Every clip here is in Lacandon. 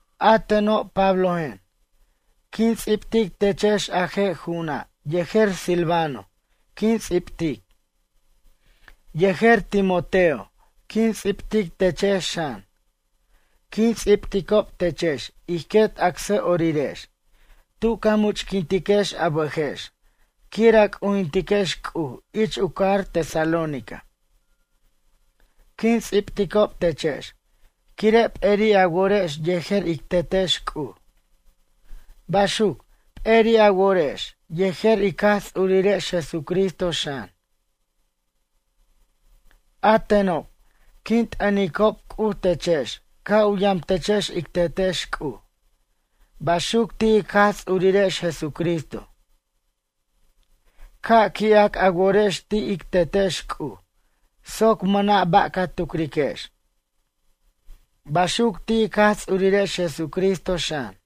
A teno', Pablojen, quin ts'ibtic techex a je' ju'una' yejer Silvano quin ts'ibtic. Yejer Timoteo quin ts'ibtic techex xan. Quin ts'ibticob techex ij quet acsʌ'orirex tu ca much'quintiquex a bʌjex quir a c'ujintiquex C'uj ich u cajar Tesalónica. Quin ts'ibticob techex quire' p'eri' a worex yejer ic Tetex C'uj. Baxuc, p'eri' a worex yejer ic Jaj Ts'urirex Jesucristo xan. A tenob, quin t'ʌnicob C'uj techex ca' u yamtechex ic Tetex C'uj. Baxuc ti' ic Jaj Ts'urirex Jesucristo. Ca' qui'ac a worex ti' ic Tetex C'uj soc mʌna' ba' ca tucriquex. Baxuc ti' ic Jaj Ts'urirex Jesucristo, xan.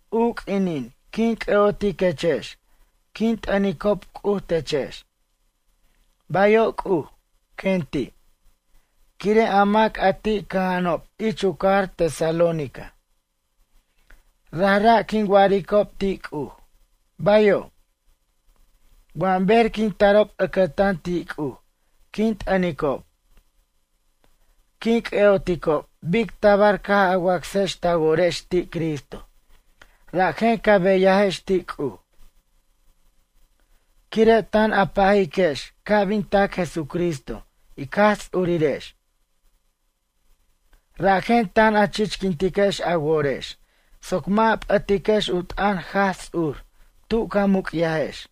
U q'uinin quin c'ʌ'otiquechex quin t'ʌnicob C'uj techex: “Bayo' C'uj”, quen ti', quire' a mac a ti' cʌja'anob ich u cajar Tesalónica. Rajra' quin waricob ti' C'uj: Bayo'. Wʌ ber quin tarob ʌcʌtan ti' C'uj quin t'ʌnicob. Quin c'ʌ'oticob bic tabar caj a wacsex ta worex ti' Cristo rajen ca beyajex ti' C'uj. Quire' tan a pajiquex ca' bin tac Jesucristo ic Jaj Ts'urirex. Rajen tan a chichquintiquex a worex soc mʌ' a p'ʌtiquex u t'ʌn Jaj Ts'ur tu ca muc'yajex.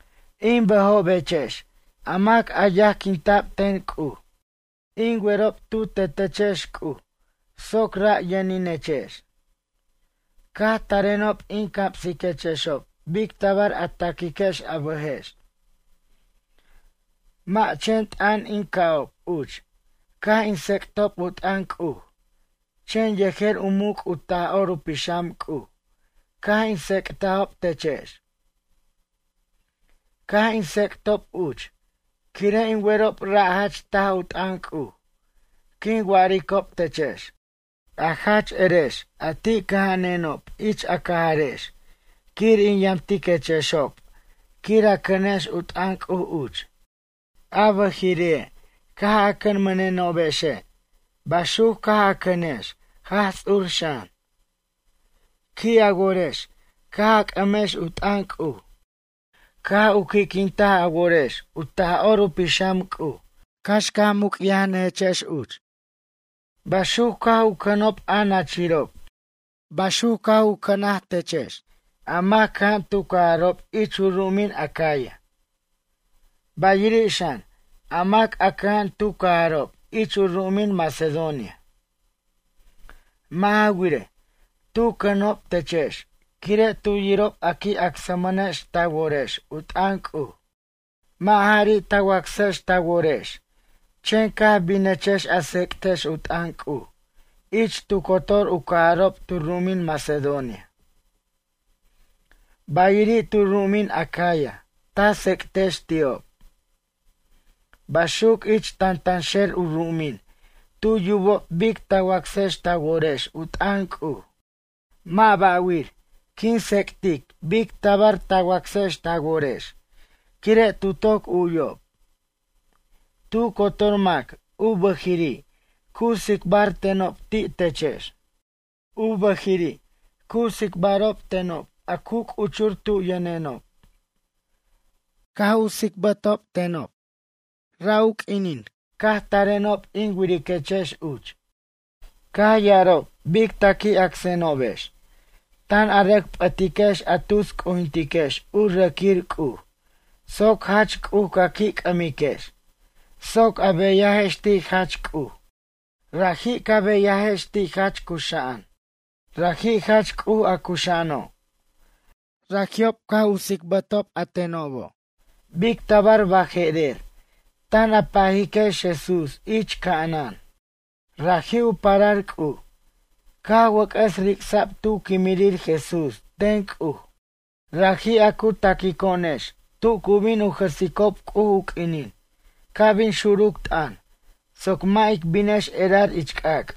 In bʌjobechex a mac a yajquinta'b ten C'uj. In werob tu tetechex C'uj soc ra' yʌninechex. Caj tarenob in camsiquechexob bic tabar a ta'quiquex a bʌjex. Mʌ' chen t'ʌn in ca'ob uch caj in tsec'tob u t'ʌn C'uj chen yejer u muc' u Taj'or u Pixam C'uj caj in tsec'tajob techex. Caj in tsec'tob uch quire' in werob ra' jach taj u t'ʌn C'uj quin waricob techex, a jach erex a ti' cʌja'anenob ich a cajarex quir in yamtiquechexob quir a cʌnex u t'ʌn C'uj uch. A bʌjiri' caj a cʌnmʌnenobexe' baxuc caj a cʌnex Jaj Ts'ur xan. Qui' a worex caj a c'ʌmex u t'ʌn C'uj. Caj u qui'quintaj a worex, u Taj'or u Pixam C'uj cax ca muc'yajnʌjex uch. Baxuc caj u cʌnob a nachirob. Baxuc caj u cʌna techex a mac cʌja'an tu cajarob ich u ru'umin Acaya. Bayiri' xan, a mac a cʌja'an tu cajarob ich u ru'umin Macedonia. Mʌ' ja wirej, tu cʌnob techex quire' tu yirob a qui' acsmʌnex ta worex u t'ʌn C'uj. Mʌ' jari' ta wacsex ta worex chen caj binechex a tsec'tex u t'ʌn C'uj ich tu cotor u cajarob tu ru'umin Macedonia. Bayiri' tu ru'umin Acaya ta tsec'tex ti'ob. Baxuc ich tantanxer u ru'umin tu yubob bic ta wacsex ta worex u t'ʌn C'uj. Mʌ' ba'wir quin tsec'tic bic tabar ta wacsex ta worex quire' tu toc u'yob. Tu cotor mac u bʌjiri' cu tsicbar tenob ti' techex. U bʌjiri' cu tsicbarob tenob a cu c'uchur tu yʌnenob. Caj u tsicbarob tenob, ra' q'uinin caj tarenob in wiriquechex uch. Caj ya'arob bic ta qui' acsenobex, tan a rʌc p'ʌtiquex a tus c'ujintiquex u rʌquir c'uj soc Jach C'uj ca qui' c'ʌmiquex soc a beyajex ti' Jach C'uj. Raji' ca beyajex ti' jach cuxa'an. Raji' jach C'uj a cuxa'ano'. Raji'ob caj u tsicbatob a tenobo' bic tabar baje'rer tan a pajiquex Jesús ich ca'anan. Raji' u parar C'uj, caj wʌc'ʌs ric'sa'b tu quimirir Jesús ten C'uj. Raji' a cu ta'quico'onex tu cu bin u jʌsicob C'uj u q'uinin ca' bin xuruc t'ʌn soc mʌ' ic binex erar ich c'ac'.